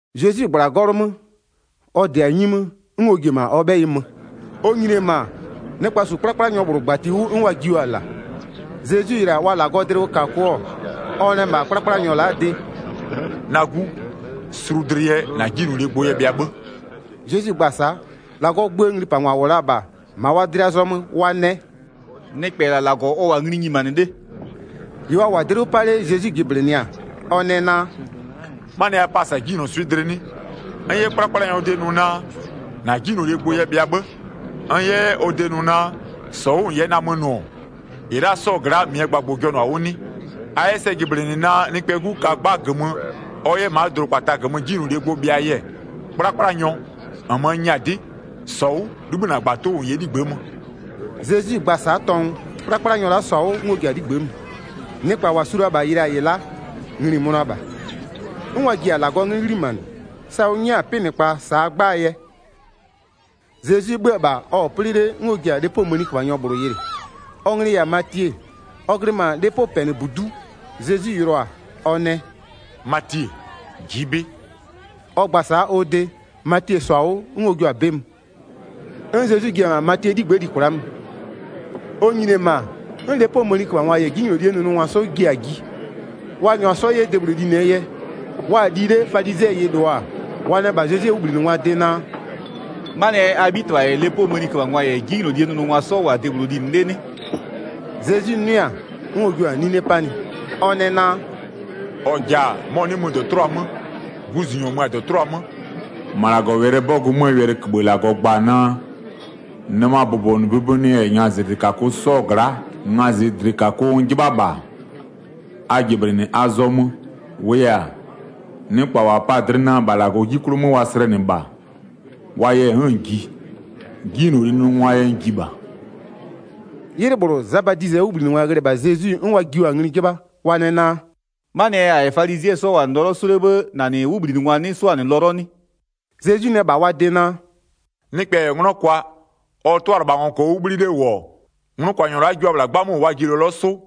Zezwi -gbla-a 'gɔlʋ 'mö, ɔ -dɩ-a 'nyi 'mö, 'n ɔ ji-e -ma ɔ 'bhɛyɩ mö. Ɔ nyini-e -ma, nɩkpa -su 'kplakplanyɔ -bhlʋ -gbati 'wʋ 'n wa jio-a -la. Zezwi yɩlɩ-a wa -Lagɔɔ dlɩwʋkakʋ-ɔ, ɔ nɛ -bha 'kplakplanyɔ la'aa de: “Na 'gu, sulu dlɩ yɛ -na 'jinylolie gbʋ yɛ bhɩa 'bhë.” Zezwi gba-a sa'a, -Lagɔɔ gböö nglipangwa -wʋ la-a -bha, -ma wa dlɩa zɔmö wa nɛ: “Nɩkpɛ -la -Lagɔ ɔ -wʋ-a ngli nyimanɩ 'le.” 4-Ɩ wa -wʋ-a dlɩ 'wʋ 'pa 'le Zezwi jɩblɩnɩɩ-a, ɔ nɛ naa: “'Manɩɛ yɛ a pa-a -sa 'jinylɔswɩ'ɩ dlɩ 'nɩ? N 'yɛ 'kplakplanyɔɔ de nʋ naa, -na 'jinylolie gbʋ yɛ bhɩa 'bhë, n 'yɛ 'yɛ ɔ de nʋ naa, -sɔ 'wʋ -n 'yɛ namö nʋ-ɔ, -ɩ la'a 'sɔɔ gla'a -mɩɛ gbagbʋ-ʋ jɔnʋ-a 'wʋ 'nɩ? A 'yɛ sɛ jɩblɩnɩ naa Nɩkpɛɛ 'Gu ka 'gba -gömö ɔ 'yɛ ma'a dʋdʋkpata -gömö 'jinylolie gbʋ bhɩaa yɛ-ɛ, 'kplakplanyɔ, -nmö n nyɛ-a 'dɩ, -sɔ 'wʋ 'libhï -na -gbatʋ 'wʋ -n 'yɛ 'ligbë'ë mö.” Zezwi gba-a sa'a tɔngʋ, 'kplakplanyɔ la'a -sɔ-a 'wʋ 'n ɔ ji-a 'ligbë'ë mö. Nɩkpa -wa su la-a -bha yɩlɩ-a -ɩ la'a, ngli-i mönʋa -bha, 'n wa ji-a -Lagɔɔ 'nglɩ 'ghlimanɩ, sa ʋ 'nyɛ-a 'pɩnɩkpa -saa 'gbaa yɛ. Zezwi 'bhö-ö -bha, ɔ-ɔ 'plɩ 'le 'n ɔ ji-a lepoo mëniköbhanyɔ -bhlʋ yɩlɩ, ɔ nglɩ-ɩ -yɛ-a Matie, ɔ glɩ -ma lepopɛnɩbudu'u, Zezwi yɩlɩɔ-a, ɔ nɛ: “Matie, ji'i 'bɩ.” Ɔ gba-a sa'a ɔ de, Matie -sɔ-a 'wʋ 'n ɔ jio-a 'bɩ mö. 'N Zezwi ji-e -ma Matiee 'ligbë'ë li kwla'a mö. Ɔ nyini-e ma, 'n lepoo mëniköbhangwa -yɛ 'jinylolie nʋnʋngwa 'sɔ ji-a ji, wa -nyʋa 'sɔ 'yɛ debhlʋ linɩɛ yɛ. Wa-a li 'le falizɩɛ yɩlɩɔ-a, wa nɛ -bha Zezwie 'wʋbhlinɩngwaa de naa: “'Manɩɛ yɛ a 'bhitɩbha -yɛ lepoo mëniköbhangwa -yɛ 'jinylolie nʋnʋngwa 'sɔ -wʋ-a debhlʋ linɩ 'le 'nɩ?” Zezwi 'nʋɩ-a, 'n ɔ jua-a 'nine 'panɩ. Ɔ nɛ naa: “-Ɔ -ja-a, mɔ-ɔ 'nɩ mö -dɔtʋlʋa 'mö, guzunyɔ mö-a -dɔtʋlʋa 'mö. 13-Ma -Lagɔwɛlɩɛ 'bɔgʋ 'mö, wɛlɩköbhë -Lagɔ gba-a naa: Nɩmaa bʋbɔnʋbʋbɔnʋɛ -yɛ ngazɩdlɩkakʋ 'sɔɔ gla'a, ngazɩdlɩkakʋ n 'jɩbha -bha, a jɩblɩnɩ a zɔmö. -Wʋʋ yɛ-a, nɩkpa -wa pa-a dlɩ naa -bha -Lagɔɔ 'ji 'klʋ 'mö wa slɛnɩ -bha, wa yɛ n'n-n ji, 'jinylolie nʋngwaa yɛ n ji -bha.” 'Ylɩ -bhlʋ, Za Badizɩɛ 'wʋbhlinɩngwa ghlɩ-ɛ -bha Zezwi 'n wa jio-a ngli 'jɩbha. Wa nɛ naa: “'Manɩɛ yɛ -a -yɛ -nɩ falizɩɛ 'sɔ -wʋ-a lɔlɔ -sʋ 'le 'bhë 'n -na -nɩ 'wʋbhlinɩngwa 'nɩ 'sʋ-a lɔlɔ 'nɩ?” Zezwi nɛ -bha wa de naa: “Nɩkpɛ -yɛ 'nglɔ kwa, ɔ 'tʋalɩbhangwa -kɔɔ 'wʋ 'bhli 'le -wʋ-ɔ, nglʋkwanyɔ la'a jua-a -bhla 'gbamö -wʋ wa ji lɔlɔ 'sʋ?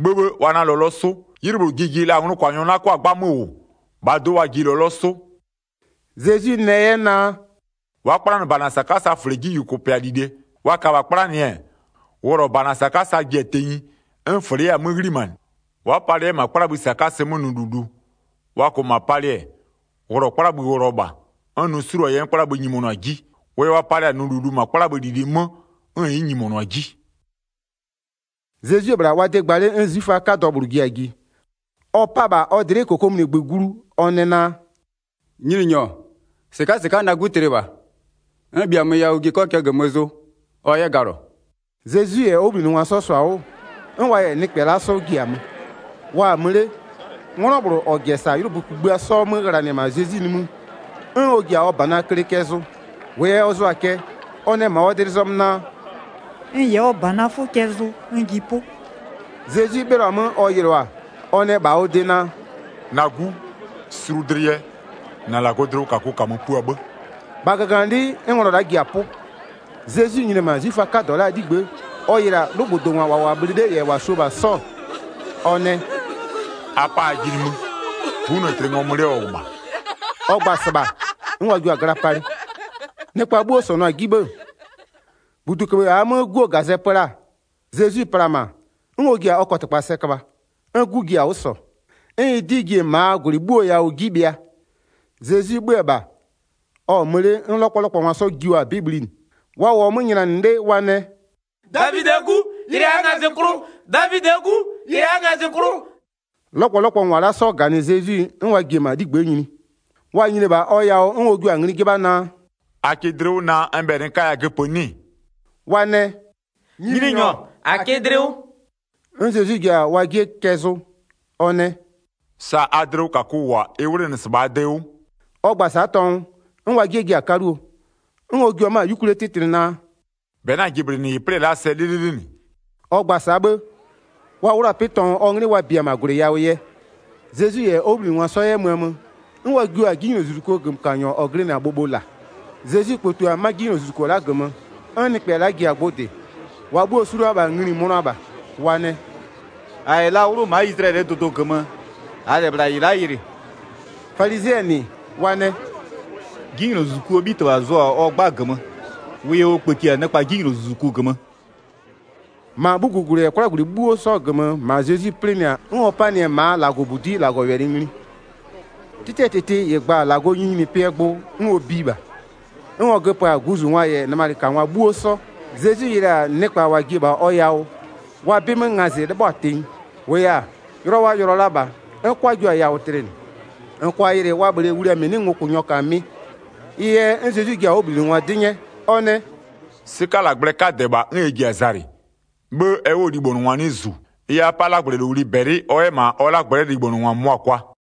'Bhëbhë, wa 'na lɔlɔ 'sʋ. 'Ylɩ -bhlʋ ji ji la nglʋkwanyɔ 'na 'kʋa-a 'gbamö -wʋ, -bhaa do'o wa ji lɔlɔ 'sʋ.” Zezwi nɛ 'yɛ naa: “Wa'a 'kplanɩ -bana -sakasaa -fle 'ji -yʋkʋpɩa -lile. Wa -kaa -bha 'kplanɩ-ɛ, wʋlɔ -bana -sakasa ji-a tenyi, 'n -fle 'yɛ-a 'ghlimanɩ. Wa'a palɩ 'yɛ -ma 'kplabhï -sakasɩ 'mö nʋ -lulu, wa -kʋʋ -ma palɩ-ɛ, wʋlɔ 'kplabhï wʋlɔ -bha, 'n nʋ 'suluo-a yɛ 'n 'kplabhï nyimonʋ-a 'ji. Wʋ yɛ wa palɩ-a nʋ -lulu -ma 'kplabhï -lili 'mö 'n ɩ'ɩ nyimɔnʋ-a 'ji.” Zezwi-e -bhla wa de gba 'le 'n 'zwiföaa 'kadɔ -bhlʋ ji-a ji, ɔ 'pa-a -bha ɔ dlɩ'ɩ -kokomunigbö glu ɔ nɛ naa: “Nyininyɔ, -sɩka'a -sɩka'a na 'gu tlɩ -bha, n -bhiamö yawʋ ji -n 'kɔ cɛ -gömö zʋ, ɔ 'yɛ galɔ.” Zezwi -yɛ ɔ 'wʋbhlinɩngwa 'sɔ -sɔ-a 'wʋ, 'n wa -yɛ nɩkpɛ la'a 'sɔ ji-a mö. Wa-a mö 'le, 'nglɔ -bhlʋ -ɔ -jɛ -sa la-a 'ylʋbö kugbïa 'sɔ 'mö ghlanɩ-ɛ -ma Zezwi nimï, 'n ɔ ji-a ɔ -banaa kle cɛ zʋ. 21-Wʋʋ yɛ ɔ zʋa-a cɛ, ɔ nɛ -ma ɔ dlɩ zɔmö naa: “N -yɛ ɔ -banaa 'fʋ cɛ zʋ n ji 'pʋ.” Zezwi 'bhɩlɔ-a 'mö ɔ yɩlɩɔ-a, ɔ nɛ -bha ɔ de naa: “Na 'gu, sulu dlɩ yɛ, -na -Lagɔɔ dlɩwʋkakʋ -kamö pua 'bhë.” -Bha -gaganɩlɩ'ɩ 'n nglɔ la'a ji-a 'pʋ. Zezwi nyini-e -ma 'zwiföaa 'kadɔ la'aa 'ligbë'ë, ɔ yɩlɩ-a 'lʋgbʋdongwa -wa -wʋ-a bhlɩ 'le -yɛ -wa su-o -bha 'sɔ-ɔ, ɔ nɛ: “A 'pa ajɩ nimï, 'gu 'nɩ-ɛ tlɩ, ngɔmö 'le ɔ -wʋ -bha.” Ɔ gba-a -sɩbha, 'n wa jio-a gla palɩ. Nɩkpa 'bhuo -sɔnʋ-a 'ji 'bhë, -buduköbhë -aa 'mö 'guo -gazɛ pö la-a, Zezwi pla-a -ma, 'n ɔ ji-a ɔ kɔtɩkpa sɛ köbha, 'n 'gu ji-a 'wʋ -sɔ. 'N ɩ 'dɩ ji-e -maa -gwlɩ 'bhuoo yawʋ 'ji bhɩa. Zezwi 'bhö-ö -bha, ɔ-ɔ mö 'le 'n 'lɔkpɔlɔkpɔngwa 'sɔ jio-a 'bɩ bhlinɩ. Wa -wʋɔ 'mö nylanɩ 'le wa nɛ: “Davidɩɛ 'Gu, yɩlɩ -aa ngazɩklʋ.” 'Lɔkpɔlɔkpɔngwa la'a 'sɔ -ganɩ Zezwi, 'n ɔ ji-e -ma 'ligbë'ë nyini. Wa nyini-e -bha ɔ yawʋ 'n ɔ jua-a ngli 'jɩbha naa: “A kɩ dlɩ 'wʋ naa n bhɛlɩ n 'kaya göpö 'nɩ-ɩ?” Wa nɛ: “Nyininyɔ, -a kɩ dlɩ 'wʋ.” 'N Zezwi ji-a wa 'jie cɛ zʋ. Ɔ nɛ: “Sa a dlɩwʋkakʋ -wʋ-a, ɩ 'wlenɩ -sɩbha a de 'wʋ.” Ɔ gba-a sa'a tɔngʋ, 'n wa 'jie ji-a 'kaluo. 'N ɔ jua 'mö-a 'yukwlie 'tɩtlɩ naa: “-Bɛ 'na-a jɩblɩnɩ -ɩ plɩ-ɛ la'aa sɛ 'lɩlɩlɩ -nɩ.” Ɔ gba-a sa'a 'bhë, wa 'wlʋ-a 'pɩ tɔngʋ ɔ 'nglɩ wa bia-a -ma -gwlɩ yawʋ yɛ. Zezwi -yɛ ɔ 'wʋbhlinɩngwa 'sɔ 'yɛ möö mö, 'n wa jio-a 'jinylozuzukuo -gömökanyɔ -ɔ glɩnɩ-a bhobho -la. Zezwi kpëtio-a 'ma 'jinylozuzuko -gömö, 'n nɩkpɛ la'a ji-a gbʋ -dɩ, -wa bhuo-o su la-a -bha ngli-i mönʋa -bha. Wa nɛ: “-A -yɛ la 'wlʋ ma'a Izlayɛlɩɛ dʋdʋ -gömö, -aa -lɛ -bhla -ɩ la'a yɩlɩ.” Falizɩɛ -nɩ wa nɛ: “'Jinylozuzukuo 'bhitɩbha zʋɔ-a ɔ 'gba -gömö, wʋ yɛ ɔ kpëti-a nɩkpa 'jinylozuzuku -gömö.” Sa nɩkpa -bhï-a Zezwi ngazɩ'ɩ 35-Ma 'bhugugwlɩ -yɛ 'kwlagwlɩ 'bhuo 'sɔɔ -gömö -ma Zezwi 'plɩnɩ-a 'n ɔ panɩ-ɛ -maa -Lagɔbudi'i -Lagɔwɛlɩ ngli, 'tɩtɩɛ -tɩtɩ -ɩ gba-a -Lagɔɔ nyininyinipɩɛ gbʋ 'n ɔ biɩ -bha. 'N ɔ göpö-a guzungwa -yɛ nɩmalɩkangwa 'bhuo 'sɔ. Zezwi yɩlɩ-a nɩkpa -wa ji-e -bha ɔ yawʋ, wa 'bɩmö ngazɩ 'lɩbhɔ-a tenyi. -Wʋʋ yɛ-a, yʋlɔ wa yʋlɔ la -bha 'n 'kwa jua 'yɛ-a yawʋ tlɩnɩ, -n -kʋa yɩlɩ wa -bhlee wlia -mɩ 'nɩ ngokʋnyɔ -ka mɩ. Ɩ yɛ 'n Zezwi ji-a ɔ 'wʋbhlinɩngwa 'dɩ 'nyɛ, ɔ nɛ: “'Sɩkalagblɛɛ 'kadɛ -bha 'n ɛ ji-a zalɩ, 'bhë ɛ 'wʋɔ libhonʋngwa 'nɩ -zu. Ɩ yɛ a 'pa 'lagblɛlowli -bɛlɩ, ɔ 'yɛ -ma ɔ 'lagblɛ'ɛ libhonʋngwa -mʋmʋa kwa.”